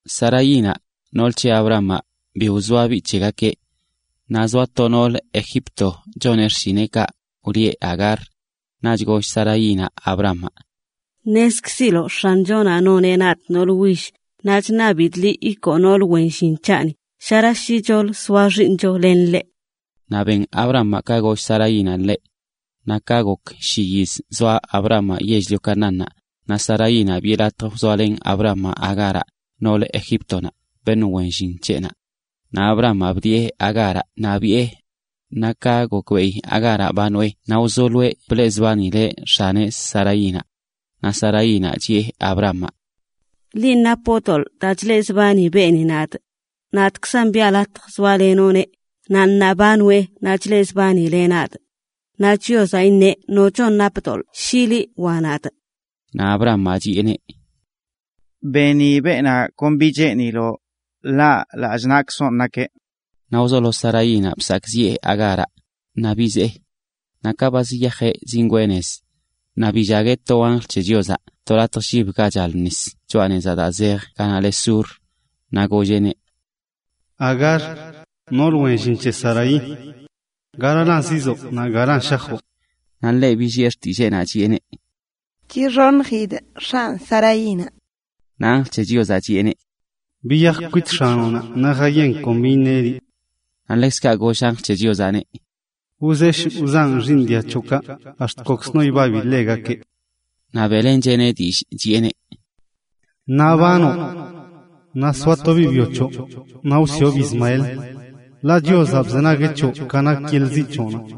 Saraínaꞌ, nool c̱he Abramaꞌ, bi wzoa biꞌ c̱hegakeꞌ. Naꞌ zoa to noolə Egipto choneꞌ xshineꞌkaꞌ, wlieꞌ Agar. Naꞌch goll Saraínaꞌ Abramaꞌ: ―Ṉezkziloꞌ X̱anchonaꞌ noneꞌ nadꞌ noolə will, naꞌ chṉabidꞌ liꞌ ikoo nool wen llin c̱haꞌni, shera shicholə soa xiiṉcho len ḻeꞌ. Naꞌ ben Abramaꞌ ka goll Saraínaꞌ ḻeꞌ. Naꞌ ka gok shi yiz zoa Abramaꞌ yell-lio Canaánnaꞌ, naꞌ Saraínaꞌ, biꞌe latj wzoalen Abramaꞌ Agáraꞌ, noolə Egíptonaꞌ, beṉꞌ wen llin c̱heꞌnaꞌ. Naꞌ Abramaꞌ bdiꞌe Agáraꞌ naꞌ biꞌe. Naꞌ ka gokbeꞌi Agáraꞌ ba noꞌe naꞌ wzoloeꞌ bleꞌzbanileꞌ x̱aneꞌ Saraínaꞌ. Naꞌ Saraínaꞌ chiꞌe Abramaꞌ: ―¡Linꞌ napoꞌ doḻꞌ daa chleꞌzbani beeni nadꞌ! Len nadaan biꞌa latj soalenoꞌneꞌ, naꞌ ṉaa ba noeꞌ naꞌ chleꞌzbanzileꞌ nadꞌ. ¡Naꞌ Chiozaꞌ iṉeꞌ nocho napə doḻꞌ shi liꞌ wa nadꞌ! Naꞌ Abramaꞌ chiꞌeneꞌ: ―Beni beenaꞌ kon bi cheeniloꞌ, ḻaˈ lallꞌ naꞌkzonꞌ nakeꞌ.(was missing here) Naꞌ wzolo Saraínaꞌ bsakꞌziꞌe Agáraꞌ, naꞌ bizee. Naꞌ ka ba ziyajeꞌ zingwee nez, naꞌ billagueꞌ to anjl c̱he Chiozaꞌ to latj llib ga chal nis choꞌa nez daa zej ganaꞌ le Sur. Naꞌ golleꞌneꞌ: ―Agar, nool wen llin c̱he Saraí, ¿garalan zizoo naꞌ galan shajoꞌ? Naꞌ ḻeꞌ billiꞌe xtilleenaꞌ, chiꞌeneꞌ: ―Chixoṉjidꞌ x̱anꞌ Saraínaꞌ. Naꞌ anjl c̱he Chiozaꞌ chiꞌeneꞌ: ―Biyaj kwit x̱anoꞌnaꞌ naꞌ jayen kon bi iṉeꞌ liꞌ. Naꞌ ḻekzkaꞌ goll anjl c̱he Chiozaꞌneꞌ: “Wzesh wzanꞌ xiiṉ dia c̱hoꞌkaꞌ, ax̱t kokzno ibabi ḻegakeꞌ.” Naꞌ beꞌlencheꞌneꞌ dillꞌ, chiꞌeneꞌ: “Ṉaa ba noꞌ, naꞌ soa to biꞌ byo choꞌ, naꞌ wsiꞌobꞌ Ismael, ḻaꞌ Chiozaꞌ bzenagueꞌ c̱hoꞌ ka nak yeḻꞌ ziꞌ c̱hoꞌnaꞌ.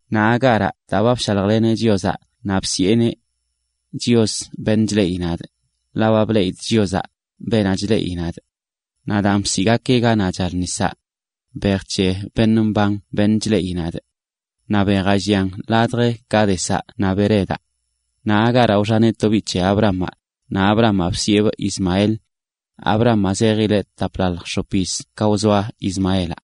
Naꞌ Agáraꞌ daa ba bshaljleneꞌ Chiozaꞌ naꞌ bsiꞌeneꞌ: “Chios, beṉꞌ chleꞌi nadꞌ”, ḻaꞌ ba bleꞌidꞌ Chiozaꞌ, beenaꞌ chleꞌileꞌ nadꞌ. Naꞌ daan bsiꞌgakeꞌ ganaꞌ chal nisaꞌ: “Bej c̱he beṉꞌ mban beṉꞌ chleꞌileꞌ nadꞌ”. Naꞌ bejaꞌ llian ladj Cádezaꞌ naꞌ Beredaꞌ. Naꞌ Agáraꞌ wxaneꞌ to biꞌ c̱he Abramaꞌ, naꞌ Abramaꞌ bsiꞌebꞌ Ismael. Abramaꞌ zejileꞌ taplalj x̱op yiz ka wzoa Ismaelaꞌ.